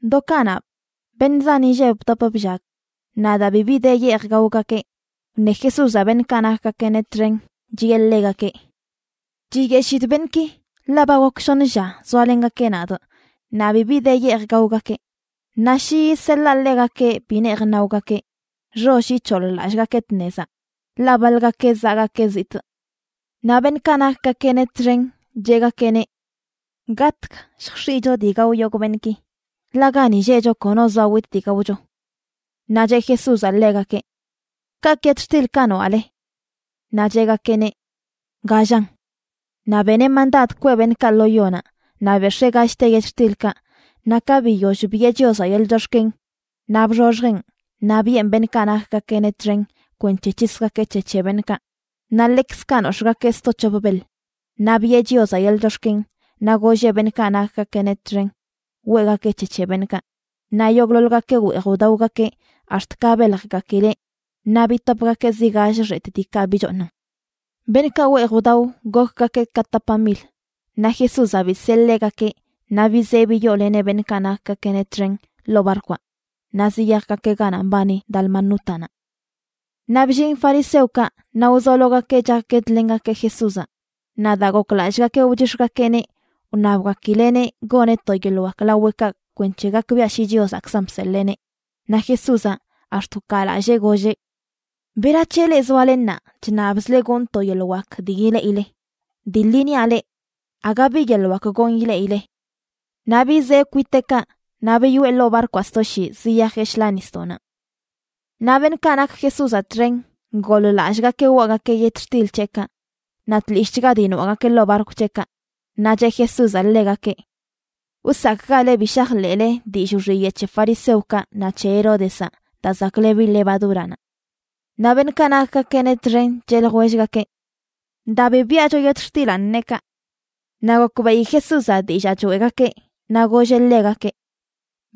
Do kanaꞌ, beṉꞌ zan inlleb bdop bllag. Naꞌ daa bibi de yeej gaogakeꞌ, wṉe Jesúzaꞌ beṉꞌkaꞌ nakgakeꞌneꞌ txen chiꞌe ḻegakeꞌ: ―Chiyeshidꞌ beṉꞌki, ḻaꞌ ba gok shoṉ lla zoalengakeꞌ nadꞌ naꞌ bibi de yeej gaogakeꞌ. Naꞌ shi yiseḻaa ḻegakeꞌ bi neej naogakeꞌ, xoll ic̱hoḻ-lallꞌgakeꞌ tnezaꞌ, ḻaꞌ baḻgakeꞌ zaꞌgakeꞌ zitꞌ. Naꞌ beṉꞌkaꞌ nakgakeꞌneꞌ txen cheꞌgakeꞌneꞌ: ―¿Gatg lljx̱iꞌcho dii gao yogꞌ beṉꞌki?, ḻaꞌ gani lleꞌcho kono zoa witꞌ dii gaocho. Naꞌ cheꞌ Jesúzaꞌ ḻegakeꞌ: ―¿Kaꞌkꞌ yetxtilkaꞌ noaꞌle? Naꞌ cheꞌgakeꞌneꞌ: ―Gallan. Naꞌ beneꞌ mandad kweꞌ beṉꞌkaꞌ lo yonaꞌ, naꞌ bex̱ee gallte yetxtilkaꞌ, naꞌ ka biyoll biꞌe Chiozaꞌ yeḻꞌ chox̱ken, naꞌ bxoxjeꞌn naꞌ biꞌen beṉꞌkaꞌ nakgakeꞌneꞌ txen kwenc̱he c̱hisgakeꞌ c̱he c̱he beṉꞌkaꞌ. Naꞌ ḻekzkaꞌ nox̱ꞌgakeꞌ zto c̱hop beḻ. Naꞌ biꞌe Chiozaꞌ yeḻꞌ chox̱ken, naꞌ golleꞌ beṉꞌkaꞌ nakgakeꞌneꞌ txen weꞌgakeꞌ c̱he c̱he beṉꞌkaꞌ. Naꞌ yogꞌḻoḻgakeꞌ weej wdaogakeꞌ ax̱t ka beljgakileꞌ, naꞌ bitopgakeꞌ zi gall xetꞌ diikaꞌ bichooṉan. Beṉꞌkaꞌ weej wdao gokgakeꞌ ka tapa mil. Naꞌ Jesúzaꞌ bisee ḻegakeꞌ naꞌ bizee biyooleneꞌ beṉꞌkaꞌ nakgakeꞌneꞌ txen ḻoo barkwaꞌ naꞌ ziyajgakeꞌ ganaꞌ mbani Dalmanútanaꞌ. Naꞌ bllin fariseokaꞌ naꞌ wzologakeꞌ chakguedlengakeꞌ Jesúzaꞌ. Naꞌ daa goklallꞌgakeꞌ wchix̱gakeꞌneꞌ, wṉabgakileꞌneꞌ goneꞌ to yeḻꞌ wak laweꞌkaꞌ kwenc̱he gakbiaꞌ shi Chiozaꞌkzan bseḻeeneꞌ. Naꞌ Jesúzaꞌ ax̱t wkaalallee, golleꞌ: ―¿Berac̱he leꞌ zoale ṉaa chṉabzle gonꞌ to yeḻꞌ wak dii ileꞌileꞌ? Dii ḻi niaꞌ leꞌ, aga bi yeḻꞌ wak gonꞌ ileꞌileꞌ. Naꞌ bizee kwiteꞌkaꞌ, naꞌ biyoꞌe ḻoo barkwaꞌ sto shii ziyajeꞌ shḻaa nisdoꞌnaꞌ. Naꞌ beṉꞌkaꞌ nak Jesúzaꞌ txen goḻ-lallꞌgakeꞌ waꞌgakeꞌ yetxtil c̱heꞌkaꞌ, naꞌ tlishꞌchga dii noaꞌgakeꞌ ḻoo barkw c̱heꞌkaꞌ. Naꞌ cheꞌ Jesúzaꞌ ḻegakeꞌ: ―Wsakꞌgale bi shajḻeꞌle dillꞌ wxiyeꞌ c̱he fariseokaꞌ naꞌ c̱he Heródezaꞌ, daa zaklebi levadúranaꞌ. Naꞌ beṉꞌkaꞌ nakgakeꞌneꞌ txen cheꞌ ljwellgakeꞌ: ―Daa bi biꞌacho yetxtilanꞌ neꞌ kaꞌ. Naꞌ gokbeꞌi Jesúzaꞌ dillaa choeꞌgakeꞌ, naꞌ golleꞌ ḻegakeꞌ: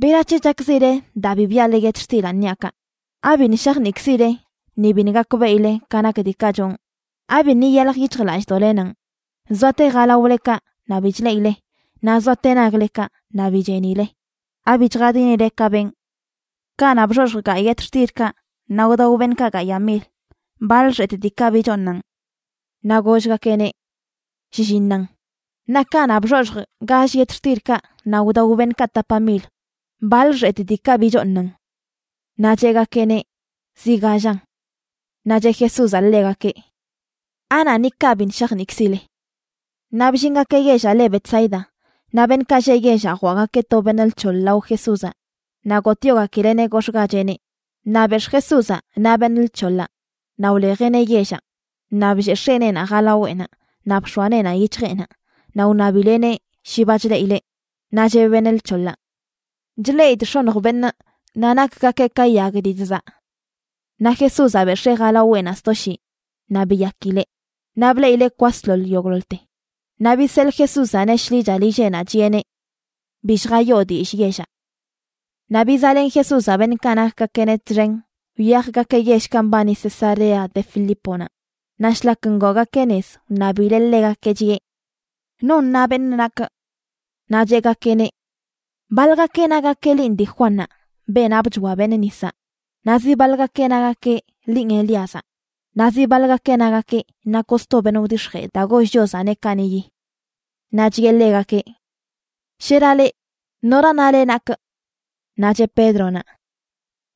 ―¿Berac̱he chakzile daa bi biꞌale yetxtilanꞌ niaꞌ kaꞌ? ¿Abiṉꞌ shajniꞌkzileꞌ ni biṉꞌ gakbeꞌile ka nak diikaꞌ chonꞌ? ¿Abiṉꞌ iyalj yic̱hjlallꞌdoꞌlenanꞌ? Zoate jalaolekaꞌ naꞌ bi chleꞌile, naꞌ zoate naglekaꞌ naꞌ bi chenileꞌ. ¿Abi chjadinile ka benꞌ? Kanaꞌ bxoxjꞌ gayꞌ yetxtilkaꞌ naꞌ wdao beṉꞌkaꞌ gayaꞌ mil, ¿baḻ xetꞌ diikaꞌ bichooṉan? Naꞌ gollgakeꞌneꞌ: ― Shlliṉan. ―Naꞌ kanaꞌ bxoxjꞌ gall yetxtilkaꞌ naꞌ wdao beṉꞌkaꞌ tapa mil, ¿baḻ xetꞌ diikaꞌ bichooṉan? Naꞌ cheꞌgakeꞌneꞌ: ―Zi gallan. Naꞌ cheꞌ Jesúzaꞌ ḻegakeꞌ: ―¿Anaꞌ ni kaꞌ biṉꞌ shajniꞌkzile? Naꞌ bllingakeꞌ yellaꞌ le Betsaida, naꞌ beṉꞌkaꞌ lleꞌ yellaꞌ jwaꞌgakeꞌ to beṉꞌ lc̱hoḻ lao Jesúzaꞌ naꞌ gotꞌyogakileꞌneꞌ gox̱ꞌgacheꞌneꞌ. Naꞌ bex̱ꞌ Jesúzaꞌ naꞌ beṉꞌ lc̱hoḻaꞌ naꞌ wlejeꞌneꞌ yellaꞌ. Naꞌ blleꞌ x̱eneenaꞌ jalaweꞌnaꞌ naꞌ bx̱oa neenaꞌ yic̱hjeꞌnaꞌ, naꞌ wṉabileꞌneꞌ shi ba chleꞌileꞌ. Naꞌ cheꞌ beṉꞌ lc̱hoḻaꞌ: ―Chleꞌidꞌ x̱oṉj beṉꞌ, naꞌ nakgakeꞌ ka yag dii chzaꞌ. Naꞌ Jesúzaꞌ bex̱ee jalaweꞌnaꞌ sto shii, naꞌ biyakileꞌ. Naꞌ bleꞌileꞌ kwasḻoḻ yogꞌḻoḻte. Naꞌ biseḻꞌ Jesúzaꞌneꞌ shḻicha lilleꞌnaꞌ, chiꞌeneꞌ: ―Bi lljayoo dillꞌ yellaꞌ. Naꞌ bizaꞌlen Jesúzaꞌ beṉꞌkaꞌ nakgakeꞌneꞌ txen wyajgakeꞌ yellkaꞌ mbani Cesarea de Filíponaꞌ. Naꞌ shlak ngoogakeꞌ nez, wṉabileꞌ ḻegakeꞌ, chiꞌe: ―¿Non na beṉꞌ nakꞌ? Naꞌ cheꞌgakeꞌneꞌ: ―Baḻgakeꞌ nagakeꞌ linꞌ dii Juannaꞌ, beenaꞌ bchoa beṉꞌ nisaꞌ, naꞌ zi baḻgakeꞌ nagakeꞌ linꞌ Elíazaꞌ, naꞌ zi baḻgakeꞌ nagakeꞌ nakoꞌ sto beṉꞌ wdix̱jee daa goll Chiozaꞌneꞌ kaniꞌyi. Naꞌ chiꞌe ḻegakeꞌ: ―Shera leꞌ, ¿nora nale nakꞌ? Naꞌ cheꞌ Pédronaꞌ: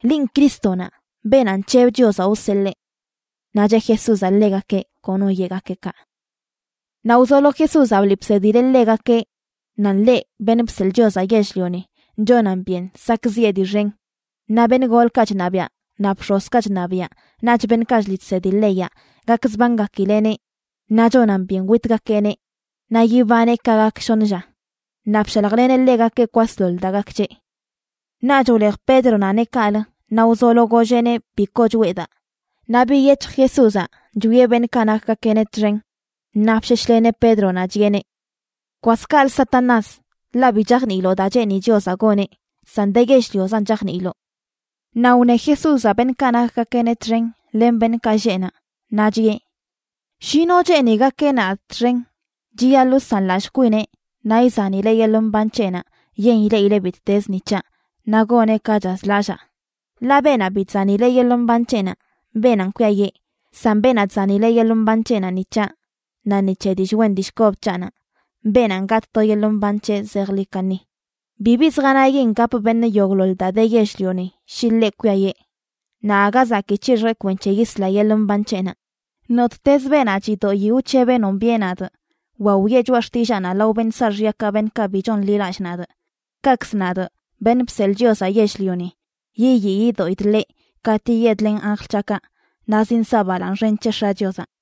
―Linꞌ Crístonaꞌ, beenaꞌ nc̱heb Chiozaꞌ wseḻee. Naꞌ cheꞌ Jesúzaꞌ ḻegakeꞌ kono yeꞌgakeꞌ kaꞌ. Naꞌ wzolo Jesúzaꞌ bliꞌ bsedileꞌ ḻegakeꞌ nan ḻeꞌ, Beṉꞌ Bseḻꞌ Chiozaꞌ Yell-lioni, chonan byen sakꞌziꞌe dii xen, naꞌ beṉꞌ golkaꞌ chṉabiaꞌ naꞌ bx̱ozkaꞌ chṉabiaꞌ naꞌch beṉꞌkaꞌ chliꞌ chsedi leyaꞌ gakzbangakileꞌneꞌ, naꞌ chonan byen witgakeꞌneꞌ naꞌ yibaneꞌ ka gak shoṉ lla. Naꞌ bshaljleneꞌ ḻegakeꞌ kwasḻoḻ daa gak c̱heꞌ. Naꞌch wlej Pédronaꞌneꞌ kaꞌlə naꞌ wzolo golleꞌneꞌ bi koo choꞌe daa. Naꞌ biyec̱hj Jesúzaꞌ chwieꞌ beṉꞌkaꞌ nakgakeꞌneꞌ txen, naꞌ bsheshleneꞌ Pédronaꞌ, chiꞌeneꞌ: ―¡Kwas kaꞌlə, Satanás!, ḻaꞌ bi chajniiloꞌ daa cheeni Chiozaꞌ goneꞌ, san de yell-liozan chajniiloꞌ. Naꞌ wṉe Jesúzaꞌ beṉꞌkaꞌ nakgakeꞌneꞌ txen len beṉꞌkaꞌ lleꞌ naꞌ, naꞌ chiꞌe: ―Shi no cheeni gakeꞌ nadꞌ txen, chiyaḻꞌ wsanlallꞌ kwineꞌ naꞌ izanileꞌ yeḻꞌ mban c̱heꞌnaꞌ yen ileꞌileꞌ bittez ni c̱haꞌ, naꞌ goneꞌ ka chazlallaa. Ḻaꞌ beenaꞌ bi chzanileꞌ yeḻꞌ mban c̱heꞌnaꞌ, beenanꞌ kwiayiꞌ, san beenaꞌ chzanileꞌ yeḻꞌ mban c̱heꞌnaꞌ ni c̱haꞌ naꞌ ni c̱he dillꞌ wen dillꞌ kob c̱haꞌnaꞌ, beenanꞌ gatꞌ to yeḻꞌ mban c̱heꞌ zejḻi kaṉi. Bibi zjanayin gap beṉꞌ yogꞌḻoḻ daa de yell-lioni, shi ḻeꞌ kwiayee. Naꞌ aga zakii c̱hixjeꞌ kwenc̱he yisla yeḻꞌ mban c̱heꞌnaꞌ. Nottezə beenaꞌ chidoꞌi wc̱hebeꞌ nombiꞌe nadꞌ wa wiꞌe choꞌa xtillaanaꞌ lao beṉꞌ saaxyakaꞌ beṉꞌkaꞌ bi chonḻilallꞌ nadꞌ, kaꞌkzə nadꞌ, Beṉꞌ Bseḻꞌ Chiozaꞌ Yell-lioni, yiyii yidoꞌidꞌ ḻeꞌ katꞌ yiyedlenꞌ anjl c̱haꞌkaꞌ naꞌ zinsaꞌ balaaṉ xen c̱he X̱aꞌ Chiozaꞌ.